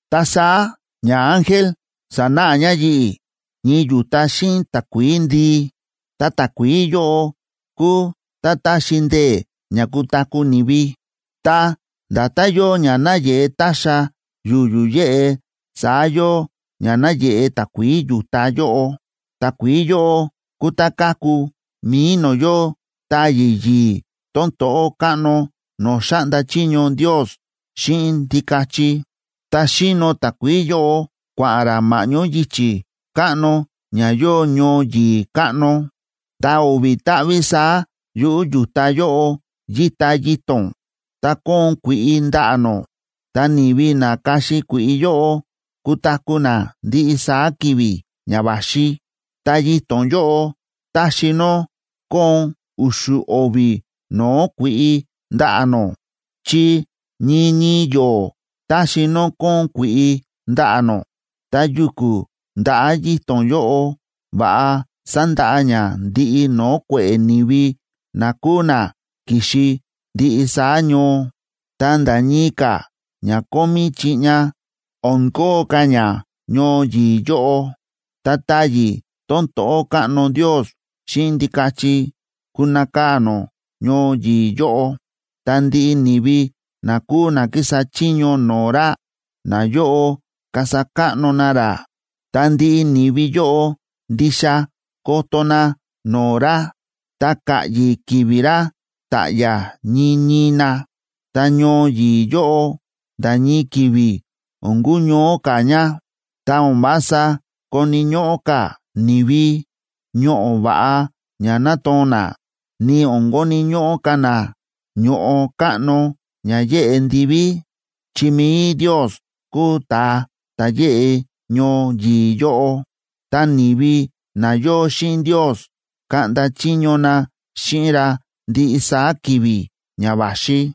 Ta saá ñaángel sa̱náꞌa ña yi̱ꞌi̱ ñii yu̱ta xíꞌin takuií ndii, ta takuií yóꞌo kúu tá táxi ndee̱ ña kutaku̱ ni̱vi. Ta nda̱tán yóo ña náyeꞌe táxa yu̱yu̱ yéꞌe saá yóo ña náyeꞌe takuií yu̱ta yóꞌo. Takuií yóꞌo kúu tá káku mi̱i no̱o̱ yóo táyi̱ yi̱i̱ tón to̱ꞌó káꞌno no̱o̱ xáꞌnda chiño Ndios xíꞌin Ndikachi, ta xíno takuií yóꞌo kua̱ꞌa̱n rá ma̱ꞌñó yichi̱ káꞌno ña yóo ñoo yi̱i̱ káꞌno. Ta o̱vi̱ táꞌví saá yuꞌu̱ yu̱ta yóꞌo yíta yito̱n, ta kóon kui̱ꞌi ndaꞌa̱ nó. Ta ni̱vi na kaxi kui̱ꞌi yóꞌo kutaku̱ na ndiꞌi saá ki̱vi̱ ña va̱xi. Ta yito̱n yóꞌo táxi nó kóon u̱xu̱ o̱vi̱ no̱o̱ kui̱ꞌi ndaꞌa̱ nó, chi ñii ñii yo̱o̱ táxi nó kóon kui̱ꞌi ndaꞌa̱ nó. Ta yu̱ku̱ ndaꞌa̱ yito̱n yóꞌo va̱ꞌa sandaꞌa ña ndiꞌi no̱o̱ kue̱ꞌe̱ ni̱vi na kúu na ki̱xi ndiꞌi saá ñoo. Ta nda̱ ñii ka̱ ña kómí chiꞌña, o̱n kóo ka̱ ña ñoo yi̱i̱ yóꞌo. Ta táyi̱ tón to̱ꞌó káꞌno Ndios xíꞌin Ndikachi kunakaa̱ nó ñoo yi̱i̱ yóꞌo, ta ndiꞌi ni̱vi na kúu na kísa chiño no̱o̱ ra, nayóꞌo kasa káꞌno na ra. Ta ndiꞌi ni̱vi yóꞌo ndixa koto na no̱o̱ ra, ta ka̱ꞌyi̱ ki̱vi̱ ra ta̱ꞌya̱ ñii ñii na. Ta ñoo yi̱i̱ yóꞌo nda̱ ñii ki̱vi̱ o̱n kuñoó ka̱ ña, ta o̱n vása koni̱ ñóꞌó ka̱ ni̱vi ñoꞌo̱ va̱ꞌa ña natoo̱n na, ni o̱n koni̱ ñóꞌó ka̱ na ño̱ꞌo káꞌno ña yeꞌe ndiví, chi mi̱i Ndios kúu ta̱a ta̱ yeꞌe ñoo yi̱i̱ yóꞌo. Ta ni̱vi na yóo xíꞌin Ndios kaꞌnda chiño na xíꞌin ra ndiꞌi saá ki̱vi̱ ña va̱xi.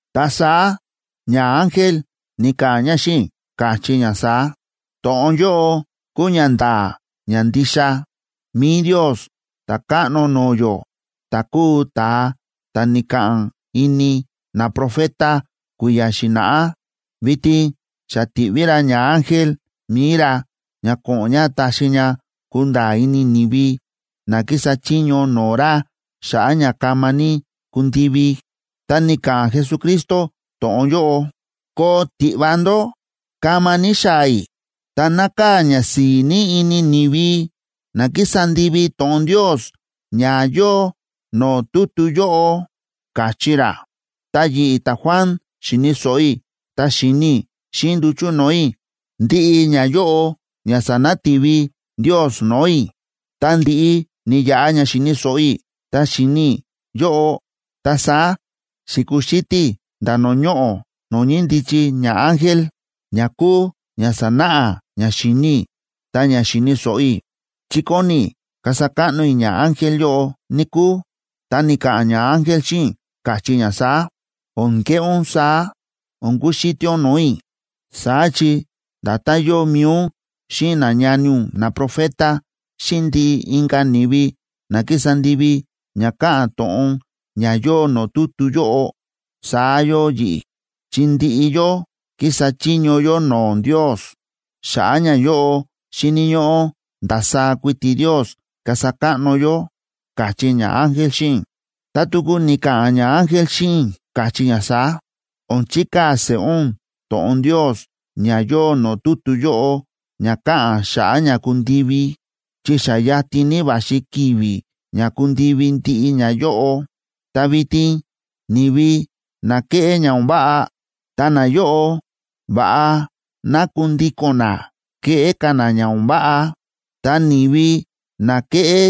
Ta saá ñaángel ni̱ka̱ꞌa̱n ña xíꞌin i̱, káchí ña saá: ―To̱ꞌon yóꞌo kúu ña nda̱a̱ ña ndixa. Mi̱i Ndios, Ta̱káꞌno no̱o̱ yó, ta̱ kúu ta̱a ta̱ ni̱ka̱ꞌa̱n ini naprofeta kui̱ya̱ xi̱na̱ꞌá, vitin xa ti̱ꞌví ra ñaángel mi̱i ra ña ko̱ꞌo̱n ña taxi ña kunda̱a̱ ini ni̱vi na kísa chiño no̱o̱ ra xa̱ꞌa̱ ña kama ní kundivi. Ta ni̱ka̱ꞌa̱n Jesucristo to̱ꞌon yóꞌo: ―¡Koo tiꞌva ndó! ¡Kama ní xaa̱ i̱! Ta nákaa̱ ñasi̱i̱ ní ini ni̱vi na kísa ndivi to̱ꞌon Ndios ña yóo no̱o̱ tutu yóꞌo ―káchí ra. Ta yi̱ꞌi̱, ta̱Juan, xi̱ni̱ so̱ꞌo i̱ ta xi̱ni i̱ xíꞌin nduchu̱ no̱o̱ i̱ ndiꞌi ñayóꞌo ña sa̱nati̱vi Ndios no̱o̱ i̱. Tá ndi̱ꞌi ni̱yaꞌa ña xi̱ni̱ so̱ꞌo i̱ ta xi̱ni i̱ yóꞌo, ta saá xi̱kuxítí i̱ nda̱ no̱o̱ ñoꞌo̱ no̱o̱ ñíndichi ñaángel, ña kúu ña sa̱náꞌa ña xi̱ni i̱ ta ña xi̱ni̱ so̱ꞌo i̱, chi kóni i̱ kasa káꞌno i̱ ñaángel yóꞌo, níkúu. Ta ni̱ka̱ꞌa̱n ñaángel xíꞌin i̱, káchí ña saá: ―O̱n keꞌé ún saá, o̱n kuxítí ún no̱o̱ i̱. Saá chi nda̱tán yóo mi̱i ún xíꞌin nañani ún naprofeta xíꞌin ndiꞌi inka̱ ni̱vi na kísa ndivi ña káꞌa̱n to̱ꞌon ña yóo no̱o̱ tutu yóꞌo, saá yóo yi̱ꞌi̱. Chi ndiꞌi yó kísa chiño yó no̱o̱ Ndios. Xa̱ꞌa̱ ñayóꞌo xíni̱ ñóꞌó ndasaá kuiti Ndios kasa káꞌno yó ―káchí ñaángel xíꞌin i̱. Ta tuku ni̱ka̱ꞌa̱n ñaángel xíꞌin i̱, káchí ña saá: ―O̱n chikaa̱ seꞌé ún to̱ꞌon Ndios ña yóo no̱o̱ tutu yóꞌo ña káꞌa̱n xa̱ꞌa̱ ña kundivi, chi xa yatin ní va̱xi ki̱vi̱ ña kundivi ndiꞌi ñayóꞌo. Ta vitin ni̱vi na kéꞌé ña o̱n váꞌa, ta nayóꞌo, va̱ꞌa ná kundíko̱n na keꞌé ka̱ na ña o̱n váꞌa. Ta ni̱vi na kéꞌé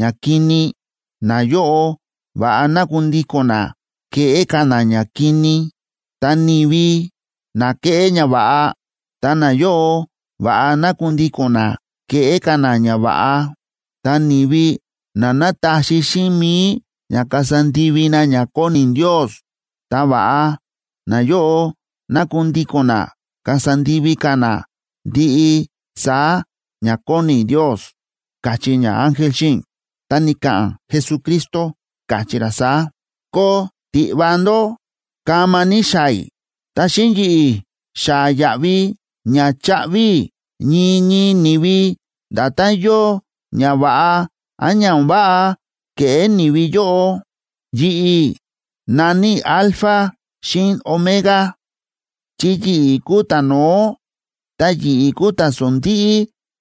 ñakini, nayóꞌo, va̱ꞌa ná kundíko̱n na keꞌé ka̱ na ñakini. Ta ni̱vi na kéꞌé ñava̱ꞌa, ta nayóꞌo, va̱ꞌa ná kundíko̱n na keꞌé ka̱ na ñava̱ꞌa. Ta ni̱vi na nátaxi xíꞌin mi̱i ña kasa ndivi na ña kóni Ndios, ta va̱ꞌa nayóꞌo ná kundíko̱n na kasa ndivi ka̱ na ndiꞌi saá ña kóni Ndios ―káchí ñaángel xíꞌin i̱. Ta ni̱ka̱ꞌa̱n Jesucristo, káchí ra saá: ―¡Koo tiꞌva ndó! ¡Kama ní xaa̱ i̱! Ta xíꞌin yi̱ꞌi̱ xaa̱ yaꞌvi ña chaꞌvi i̱ ñii ñii ni̱vi, nda̱tán yóo ña va̱ꞌa án ña o̱n váꞌa ke̱ꞌé ni̱vi yóꞌo. Yi̱ꞌi̱ na̱ní i̱ “Alfa xíꞌin Omega”, chi yi̱ꞌi̱ kúu ta̱no̱ó ta yi̱ꞌi̱ kúu ta̱sondíꞌí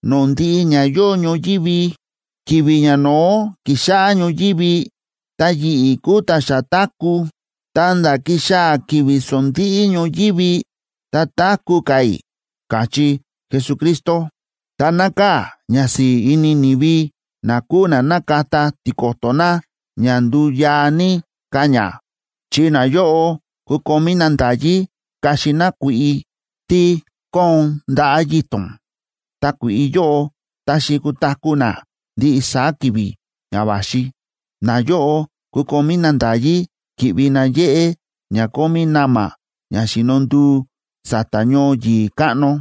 no̱o̱ ndiꞌi ña yóo ñoyívi. Ki̱vi̱ ñano̱ó ki̱xáꞌá ñoyívi, ta yi̱ꞌi̱ kúu ta̱ xa táku̱, ta̱nda̱ kixaa̱ ki̱vi̱ sondíꞌí ñoyívi, ta táku̱ ka̱ i̱ ―káchí Jesucristo. Ta nákaa̱ ñasi̱i̱ ini ni̱vi na kúu na nákata tiko̱to̱ na ña nduyaa ní ka̱ ña,a chi nayóꞌo kukomí na nda̱yí kaxi na kui̱ꞌi tí kóon ndaꞌa̱ yito̱n, ta kui̱ꞌi yóꞌo táxi kutaku̱ na ndiꞌi saá ki̱vi̱ ña va̱xi. Nayóꞌo kukomí na nda̱yí ki̱ꞌvi na yéꞌé ña kómí na̱ma̱ ña xíno nduu sa̱ta̱ ñoo yi̱i̱ káꞌno,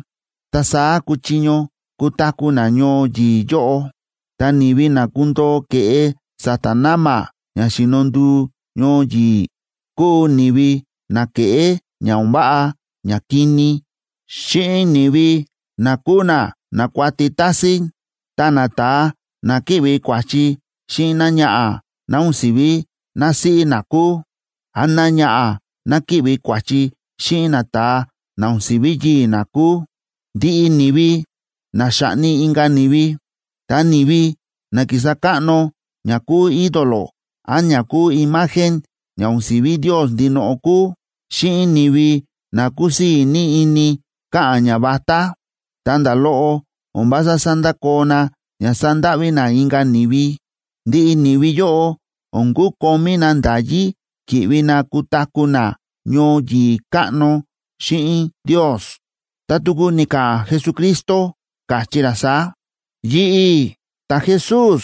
ta saá kuchiño kutaku̱ na ñoo yi̱i̱ yóꞌo. Ta ni̱vi na kundoo ke̱ꞌe sa̱ta̱ na̱ma̱ ña xíno nduu ñoo yi̱i̱, kúu ni̱vi na kéꞌé ña o̱n váꞌa ñakini, xíꞌin ni̱vi na kúu na nákuati tásín, ta nata̱a na kíꞌvi kua̱chi xíꞌin náñaꞌa̱ ná o̱n si̱ví násíꞌí na kúu, án náñaꞌa̱ ná kíꞌvi kua̱chi xíꞌin nata̱a na o̱n si̱ví yii̱ ná kúu, ndiꞌi ni̱vi na xáꞌni inka̱ ni̱vi, ta ni̱vi na kísa káꞌno ña kúu ídolo án ña kúu imagen ña o̱n si̱ví Ndios ndinoꞌo kúu, xíꞌin ni̱vi na kúsii̱ ní ini káꞌa̱n ñavatá, ta nda̱ loꞌo o̱n vása sándakoo na ña sandáꞌví na inka̱ ni̱vi. Ndiꞌi ni̱vi yóꞌo o̱n kukomí na nda̱yí ki̱ꞌvi na kutaku̱ na ñoo yi̱i̱ káꞌno xíꞌin Ndios. Ta tuku ni̱ka̱ꞌa̱n Jesucristo, káchí ra saá: ―Yi̱ꞌi̱, ta̱Jesús,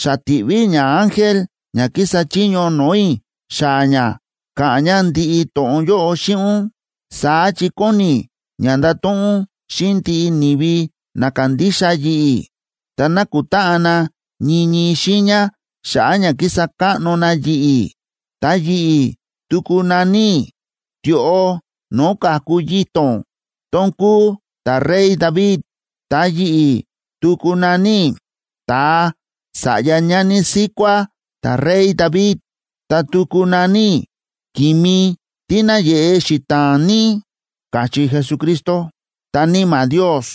xa ti̱ꞌví i̱ ñaángel ña kísa chiño no̱o̱ i̱ xaa̱ ña ka̱ꞌa̱n ña ndiꞌi to̱ꞌon yóꞌo xíꞌin ún. Saá chi kóni i̱ ña ndato̱ꞌon ún xíꞌin ndiꞌi ni̱vi na kándixa yi̱ꞌi̱ ta nákutáꞌan na ñii ñii xiiña xa̱ꞌa̱ ña kísa káꞌno na yi̱ꞌi̱. Ta yi̱ꞌi̱ tuku na̱ní i̱ “Tioꞌo no̱o̱ ka̱ku yito̱n tón kúu ta̱rey David.” Ta yi̱ꞌi̱ tuku na̱ní i̱ “Ta̱a sa̱ꞌya ñani síkuá ta̱rey David.” Ta tuku na̱ní i̱ “Ki̱mi tí náyeꞌe xita̱a̱n ní” ―káchí Jesucristo.b Ta Níma̱ Ndios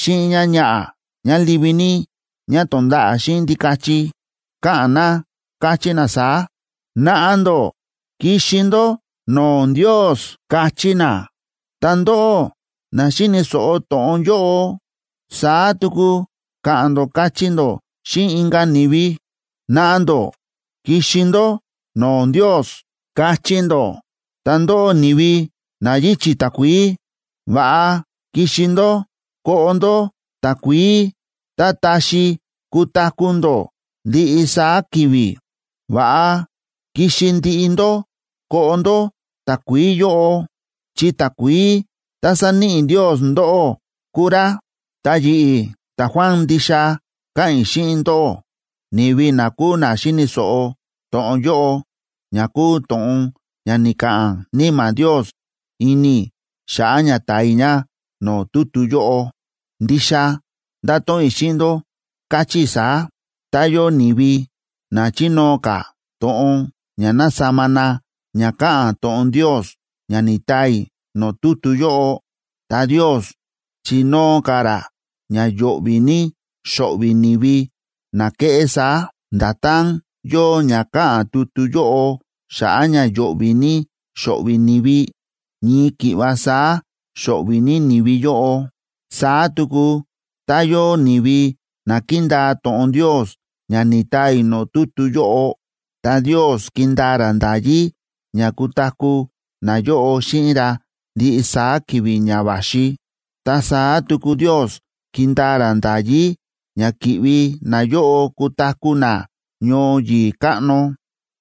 xíꞌin ñáñaꞌa̱ ñá livi ní ñá tonda̱ꞌa̱ xíꞌin Ndikachi, káꞌa̱n na káchí na saá: ―Naꞌa ndó kixi ndó no̱o̱ Ndios ―káchí na. Ta ndóꞌó na xíni̱ so̱ꞌo to̱ꞌon yóꞌo, saá tuku ka̱ꞌa̱n ndó kachí ndó xíꞌin inka̱ ni̱vi: ―Naꞌa ndó kixi ndó no̱o̱ Ndios ―kachí ndó. Ta ndóꞌó, ni̱vi na yíchi̱ takuií, va̱ꞌa kixi ndó koꞌo ndó takuií tá taxi kutaku̱ ndó ndiꞌi saá ki̱vi̱. Va̱ꞌa kixi ndiꞌi ndó koꞌo ndó takuií yóꞌo, chi takuií tá sáníꞌi Ndios ndóꞌó kúu rá. Ta yi̱ꞌi̱ ta̱Juan, ndixa káꞌa̱n i̱ xíꞌin ndóꞌó, ni̱vi na kúu na xíni̱ so̱ꞌo to̱ꞌon yóꞌo ña kúu to̱ꞌon ña ni̱ka̱ꞌa̱n Níma̱ Ndios ini i̱ xa̱ꞌa̱ ña taa i̱ ña no̱o̱ tutu yóꞌo. Ndixa ndáto̱ꞌon i̱ xíꞌin ndó, káchí i̱ saá: Tá yóo ni̱vi na chinóo ka̱ to̱ꞌon ña nasama na ña káꞌa̱n to̱ꞌon Ndios ña ni̱taa i̱ no̱o̱ tutu yóꞌo, ta Ndios chinóo ka̱ ra ña yo̱ꞌvi̱ ní xo̱ꞌvi̱ ni̱vi na keꞌé saá. Nda̱tán yóo ña káꞌa̱n tutu yóꞌo xa̱ꞌa̱ ña yo̱ꞌvi̱ ní xo̱ꞌvi̱ ni̱vi, ñii ki̱ꞌva saá xo̱ꞌvi̱ ní ni̱vi yóꞌo. Saá tuku tá yóo ni̱vi na kindaa to̱ꞌon Ndios ña ni̱taa i̱ no̱o̱ tutu yóꞌo, ta Ndios kindaa ra nda̱yí ña kutaku̱ nayóꞌo xíꞌin ra ndiꞌi saá ki̱vi̱ ña va̱xi. Ta saá tuku Ndios kindaa ra nda̱yí ña ki̱ꞌvi nayóꞌo kutaku̱ na ñoo yi̱i̱ káꞌno,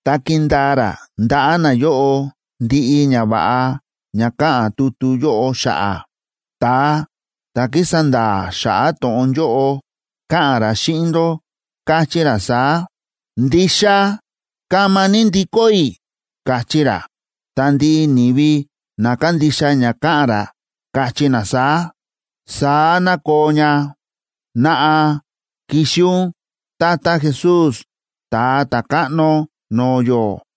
ta kindaa ra ndaꞌa̱ nayóꞌo ndiꞌi ñava̱ꞌa ña káꞌa̱n tutu yóꞌo xa̱ꞌa̱. Ta̱a ta̱ kísa nda̱a̱ xa̱ꞌa̱ to̱ꞌon yóꞌo káꞌa̱n ra xíꞌin ndó, káchí ra saá: ―Ndixa kama ní ndikó i̱ ―káchí ra. Ta ndiꞌi ni̱vi na kándixa ña káꞌa̱n ra káchí na saá: ―Saá ná koo ña. ¡Naꞌa, kixi ún, tata Jesús, Ta̱a Ta̱káꞌno no̱o̱ yó!